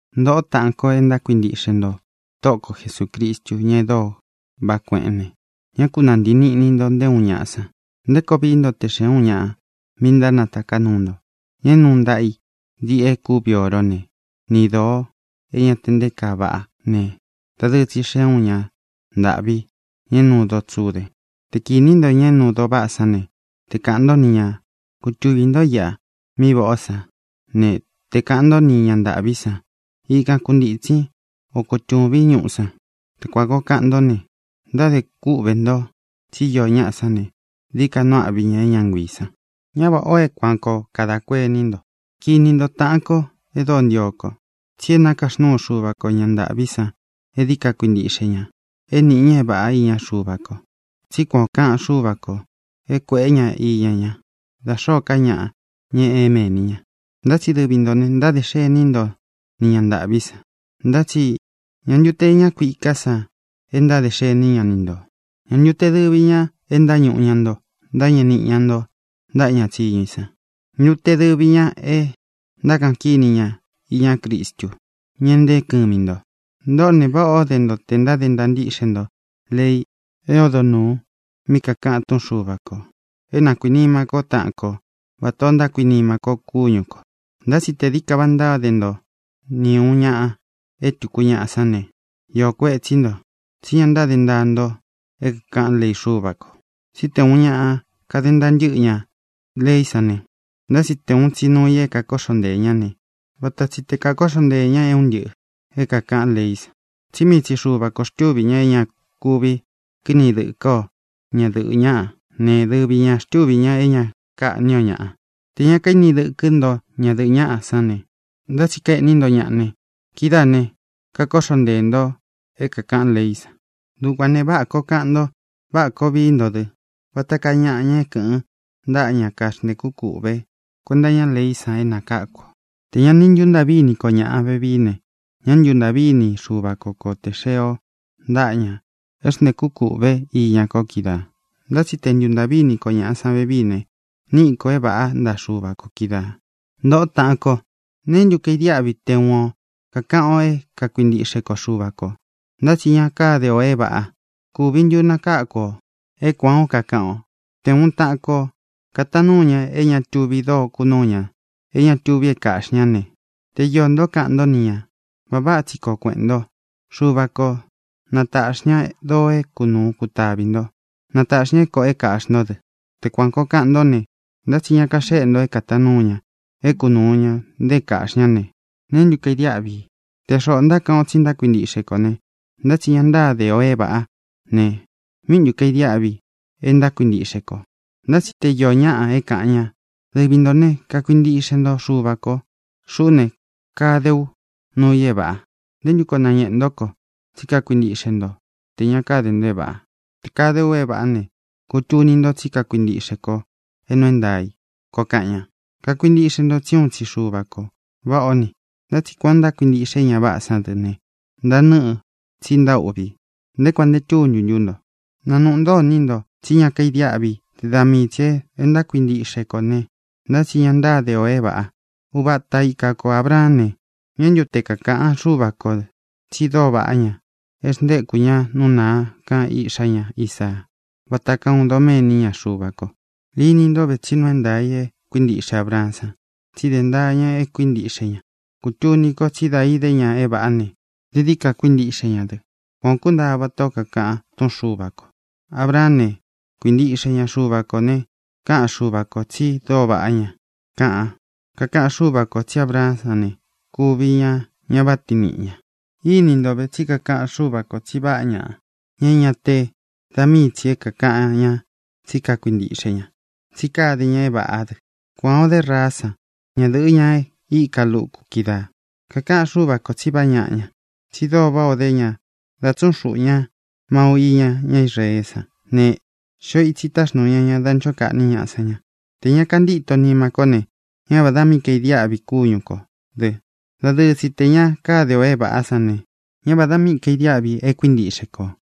Ntōꞌo, táꞌān ko e ntákuintiꞌxe nto Tóꞌo ko Jesūcristu, ña e dóo vaꞌá kueꞌén ne, ñá ku nāntii niꞌni nto nté uun ñaꞌa san. ¿Nté koo vií nto te xēe úun ñaꞌa míꞌi ntánataká nuu nto, ña é nuu ntaꞌa i diꞌi e kúvi oró ne, ni dōo é ña te nté kaa vaꞌá ne, dadɨɨ tsi xee úun ña ntāꞌví, ña é nuu doo tsude? Te kinī ntó ña é nuu doo váꞌa sán ne, tē kaꞌan ntó ni ñā: “Kutuvī ntó iꞌa mí vaꞌā ó sa”, ne, te kāꞌan ntó ni ña ntāꞌví san: “Ikan kuntītsin, o kutūvín ñuꞌu san”; te kuān koo kaꞌan ntó ne, ntádē kúꞌvē nto tsí īó ñaꞌa sán ne, dií ka nuu áꞌvi ña é ña nguiī san. Ñá vāꞌá o é kuān koo kada kuení nto. Kini nto, taꞌan ko e dóo ntio ko, tsi é nakaxnúu Xuva ko ña ntāꞌví san é dií ka kuintíꞌxe ña, é nīꞌi ña é vāꞌa iña Xuva ko. Tsí kuan ō kaꞌan Xúva kō é kuēꞌé ña iña ña, da xōó ka ñaꞌa, ña é mēni í ña. Ntá tsi dɨvi ntō ne, ntáde xení nto ni ña ntāꞌví san. Ntá tsi ¿ñā ntu te ña kuiká san e ntáde xení ña ni ntō? ¿Ñā ntu te dɨvi ña e ntáñuꞌu ña nto, ntáñeꞌe niꞌi ña nto ntaꞌa ña tsíñu i san? ¿Ñā ntu te dɨvi ña e ntákaꞌan kíni ña iña Cristu, ña e nteé kɨmi nto? Ntoꞌó ne, váꞌā ó de nto tē ntáde ntaa ntíꞌxe nto lei é odo nūu mí kākaꞌan túꞌun Xuva kō é na kuīnima kó taꞌan ko vatā o ntákuinima ko kúñu kō. Ntá tsi tē dií ka vaꞌa ntáde nto ni ūun ñaꞌa é tuku ñaꞌa sán ne, iō kuetsí nto, tsi ña ntáde ntaa nto é kākaꞌán lei Xúva kō. Tsí te ūun ñaꞌa kade ntaa ntɨ́ꞌɨ ña leí san ne, ntá tsi te ūun tsi nuu i é kakóꞌxo nteē ñá ne, vata tsi te kākóꞌxo nteē ña é un ntɨꞌɨ̄ é kākaꞌán leí san. Tsí mii tsi Xuva kō xtúvi ña é ña kuvi kiní dɨkɨ́ o ñadɨ̄ꞌɨ ñáꞌa ne, dɨvi ñā xtúvi ña é ña kaꞌní o ñaꞌa. Tē ña kaíni dɨkɨ́ nto ñadɨ̄ꞌɨ ñaꞌa sán ne, ntá tsi kaeꞌní nto ñaꞌa ne, kidáā ne, kakóꞌxo nteē nto é kākaꞌán leí san. Dukuān ne, váꞌā koo kaꞌan ntó ne, váꞌā koo vií nto dɨ vata kaa ñaꞌa, ña é kɨ̄ꞌɨn ntáꞌa ña kaxntēkú kūꞌve kuenta iñá leí san é nakáku ō. Tē ña ni ntuntaꞌví ini ko ñaꞌa vevii ne, ñá ntuntāꞌví ini Xuva ko kō te xee o ntaꞌa ña é xntēkú kūꞌve iña ko kídaā. Ntá tsi tē ntúntaꞌví ini ko ñaꞌa san vevií ne, níꞌi kō é vāꞌá ntaꞌa Xuva kō kídaā. Ntōꞌó taꞌan ko, ¿neé ntu kaidiáꞌvi i te uun o kākaꞌan o é kakuintiꞌxe ko Xuva kō, ntá tsi ña káde ō é vāꞌa? ¿Kūvi ntu nakáku ō é kuān ó kakaꞌan o? Te ūun taꞌan ko kataan núu ña é ña tuvi dóo kunúu ña, é ña tuvi é kāꞌxi ñá ne, te iō ntó kaꞌan ntó ni ñā: “Vaꞌa váꞌa tsi koo kueꞌēn nto. Xuva ko na tāꞌxi ña doo é kunūu kutavi nto. Na tāꞌxi ña é kōꞌo é kāꞌxi ntó dɨ.” Te kuan kōo kaꞌan ntó ne, ntá tsi ña kaxéꞌe nto é kataan núu ña é kunūu ña, nte é kāꞌxi ñá ne, ¿neé ntu kaidiáꞌvi i? Te xoꞌō ntákaꞌan o tsi ntákuintiꞌxe kō ne, ntá tsi ña ntáde ō é vāꞌá ne, ¿míꞌi ntu kaidiáꞌvi i e ntákuintiꞌxe kō? Ntá tsi te iō ñáꞌa é kāꞌan ña: “Dɨvi ntō né, kakuintiꞌxe nto Xuva kō. Xuꞌú ne, kade ú nuu i é vāꞌa. ¿Nté ntu koo nañēꞌe ntó ko tsí kakuintiꞌxe nto tē ña káde nto é vāꞌa? Tē kade u é vāꞌá ne, kutuni nto tsí kakuintiꞌxe ko é nuu é ntaā i”, koo kaꞌan ña. Kakuintiꞌxe ntō tsí uun tsi Xuva kō. Váꞌā ó ni. Ntá tsi kuān o ntákuintiꞌxe é ña váꞌā sán dɨ ne, ntanɨ́ꞌɨ, tsi ntaúꞌví i. ¿Nté kuān nte túntu ntú nto? ¿Na nūꞌu ntó iní nto tsí ña kaidiáꞌvi i te da mii tsī é ntákuintiꞌxe kō ne, ntá tsi ña ntáde ō é vāꞌa? Uva ata ika ko Ābraán ne, ¿ñā ntu te kakáꞌan Xúva kō tsi dóo vaꞌá ña é xntéku ña nú nāa kan iꞌxá ña, Isaa, vata kaa uun doméni iña Xuva ko? Íni nto vē tsí nuu é ntaā i e kuíntiꞌxe Abraán san, tsi dé ntaa ña e kuíntiꞌxe ña. Kutuni ko tsí da ide ña é vāꞌá ne, dií dií ka kuintíꞌxe ña dɨ. Kuan ō kúntaa vatā ó kakaꞌan túꞌun Xuva kō: “Abraán ne, kuintiꞌxe ña Xuva kō ne, kaꞌan Xúva kō tsi dóo vaꞌá ña”, kaꞌan. Kakaꞌan Xúva kō tsí Abraán san ne, kuvi ña ña váꞌa tiin niꞌi ñā. Ini ntó ve, tsí kakaꞌan Xúva kō tsi vaꞌá ñaꞌa, ña é ña te da míi tsī é kākaꞌan ña tsí kakuintiꞌxe ña, tsí kade ña é vāꞌá dɨ. Kuan ō dé Raá san, ñadɨ̄ꞌɨ, ña e íka luku kídaā. Kakaꞌan Xúva kō tsi vaꞌá ñaꞌa ña, tsi dóo váꞌā o dé ña da tsúꞌun xuꞌu ña mau iña ñá Israeé san ne, xio itsi táxnūu ña ña da nchó kaꞌní ñaꞌa sán ña. Tē ña kantíto nima kó ne, ñá vādá mi kaidiáꞌvi kúñu kō dɨ. Dadɨɨ tsi, tē ña káde ō é vāꞌá san ne, ñá vādá mi kaidiáꞌvi i e kuíntiꞌxe kō.